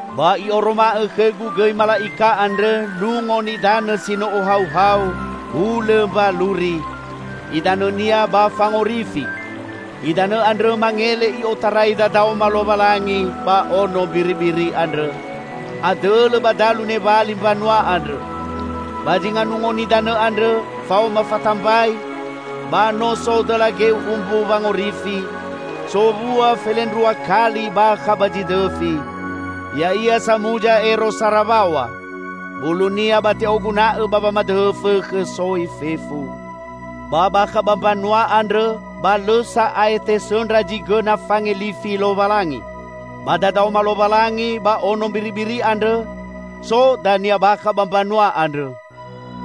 Ba i'oroma'õ khõgu gõi mala'ika andrõ nungo nidanõ si no ohauhau hulõ mbaluri; idanõnia ba fangorifi. Idanõ andrõ mangele i'otarai dadaoma Lowalangi ba Ono Mbiribiri andrõ, adõlõ ba dalu newali mbanua andrõ. Ba zinga nungo nidanõ andrõ, faoma fatambai ba no so dõla geu umbu wangorifi, sowua felendrua kali bakha ba zi dõfi, ya'ia samuza ero sara waw̃a. Bulunia ba te'oguna'õ ba wamadõhõ fõkhõ soi fefu. Ba bakha ba mbanua andrõ ba lõ sa'ae tesõndra zi gõna fangelifi Lowalangi. Ba dadaoma Lowalangi ba Ono Mbiribiri andrõ so dania bakha ba mbanua andrõ.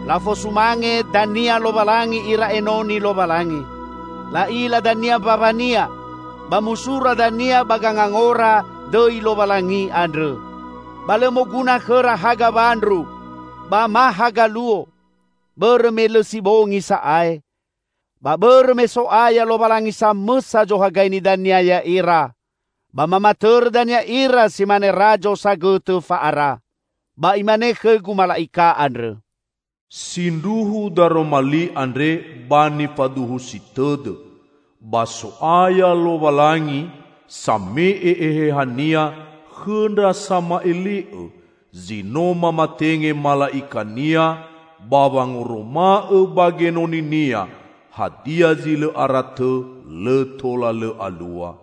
Lafosumange dania Lowalangi ira enoni Lowalangi. La'ila dania mbaw̃a-Nia. Ba musura dania ba gangangora dõi Lowalangi andrõ. Ba lõ moguna khõra haga wandru ba ma haga luo, bõrõ me lõ si bongi sa'ae, ba bõrõ me So'aya Lowalangi samõsa zohagaini dania ya'ira. Ba mamatõrõ dania ira si mane razo sagõtõ fa'ara. Ba imane khõgu mala'ika andrõ, "Sindruhu daroma li andre ba nifaduhusi tõdõ. Ba So'aya Lowalangi, same'e Eheha-Nia khõ ndra sama'ele'õ, zi no mamatenge mala'ika-Nia ba wangoroma'õ ba genoni-Nia hadia zi lõ ara tõ lõ tola lõ alua."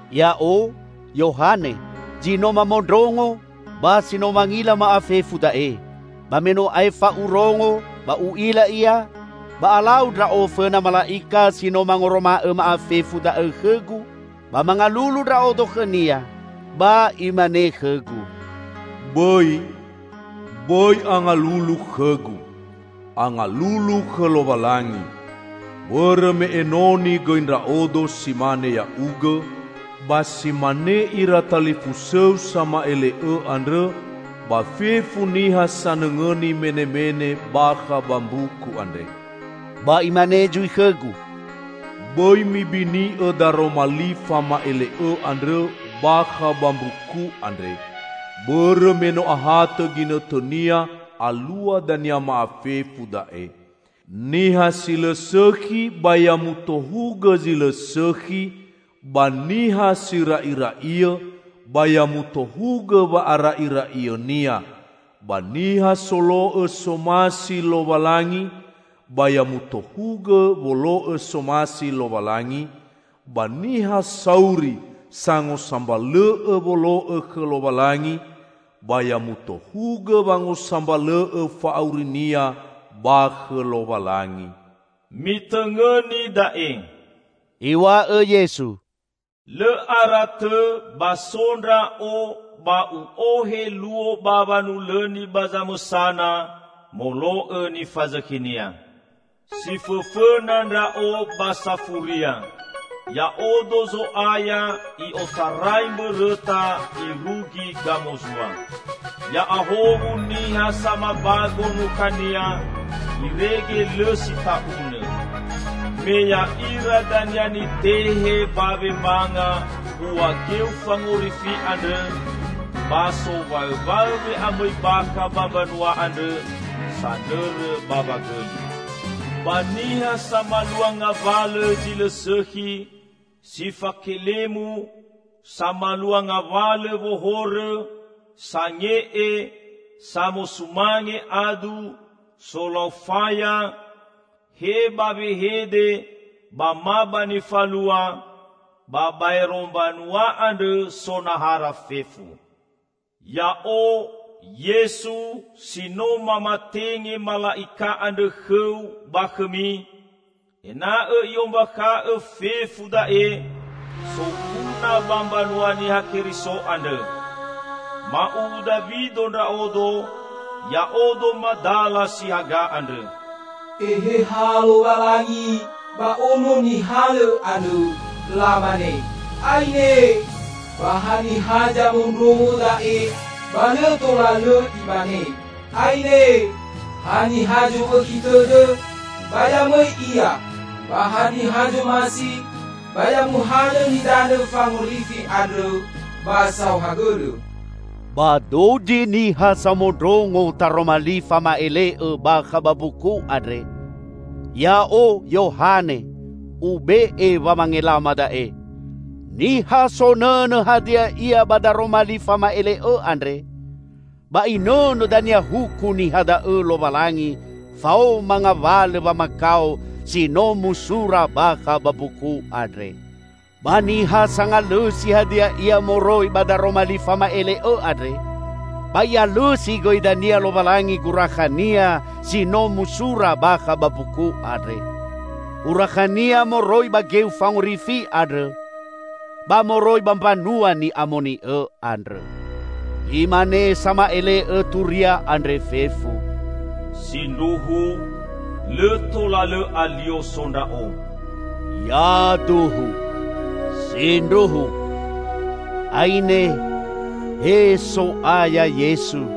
Ya'o, Yohane, zi no mamondrongo ba si no mangila ma'afefu da'e. Ba me no aefa urongo ba u'ila ia, ba alau ndra'o fõna mala'ika si no mangoroma'õ ma'afefu da'õ khõgu, ba mangalulu ndra'odo khõnia, ba imane khõgu, "Bõi! Bõi angalulu khõgu! Angalulu khõ Lowalangi! Bõrõ me enoni gõi ndra'odo si mane ya'ugõ, ba si mane ira talifusõu sama'ele'õ andrõ ba fefu niha sanõngõni menemene bakha ba mbuku andre!" Ba imane zui khõgu, "Bõi mibini'õ daroma li fama'ele'õ andrõ bakha ba mbuku andre, bõrõ me no ahatõ ginõtõnia alua dania ma'afefu da'e. Niha si lõ sõkhi, ba ya mutohugõ zi lõ sõkhi; ba niha si ra'ira'iõ, ba ya mutohugõ wa'ara'ira'iõnia; ba niha solo'õ somasi Lowalangi, ba ya mutohugõ wolo'õ somasi Lowalangi, ba niha sauri sangosambalõ'õ wolo'õ khõ Lowalangi, ba ya mutohugõ wangosambalõ'õ fa'aurinia ba khõ Lowalangi." "Mitõngõni da'e!" Iw̃a'õ Yesu, "Lõ ara tõ ba so Ndra'o ba U'ohe luo ba wanulõni ba zamõsana molo'õ nifazõkhinia. Si fõfõna Ndra'o ba safuria; Ya'odo Zo'aya i'otarai Mbõrõta irugi Gamozua." Ya'ahowu niha samabago nukhania irege lõ si ta'unõ. Me ya'ira dania nitehe ba wemanga bua geu fangorifi andrõ ba sowaõwaõ we'amõi bakha ba mbanua andrõ sanõrõ bawa gõli. Ba niha samalua ngawalõ zi lõ sõkhi, si fakelemu, samalua ngawalõ wohorõ, sange'e, samosumange adu, solau faya, he ba wehede ba ma ba nifalua, ba baero mbanua andrõ so nahara fefu. "Ya'o, Yesu, si no mamatenge mala'ika andrõ khõu ba khõmi, ena'õ i'ombakha'õ fefu da'e soguna ba mbanua Niha Keriso andrõ. Ma'uwu Dawido Ndra'odo; Ya'odo madala si haga andrõ." Eheha Lowalangi ba Ono Nihalõ andrõ, lamane, "Aine!" Ba haniha zamondrongo da'e ba lõ tola lõ imane, "Aine!" Haniha zowõkhi tõdõ, ba ya mõi ia! Ba haniha zomasi, ba ya muhalõ nidanõ fangorifi andrõ, ba saohagõlõ! Ba dozi niha samondrongo Taroma Li fama'ele'õ bakha ba mbuku andre, ya'o, Yohane, ube'e wamangelama da'e: Niha sonõnõ hadia ia ba Daroma Li fama'ele'õ andre, ba Inõnõ dania huku niha da'õ Lowalangi faoma ngawalõ wamakao si no musura bakha ba mbuku andre. Ba niha sangalõsi hadia ia moroi ba Daroma Li fama'ele'õ andre, ba I'alõsi gõi dania Lowalangi gurakhania si no musura bakha ba mbuku andre -- urakhania moroi ba geu fangorifi andrõ ba moroi ba mbanua ni'amoni'õ andrõ. Imane sama'ele'õ turia andre fefu, "Sindruhu, lõ tola lõ alio so ndra'o!" Yaduhu! Sindruhu! Aine, he So'aya Yesu!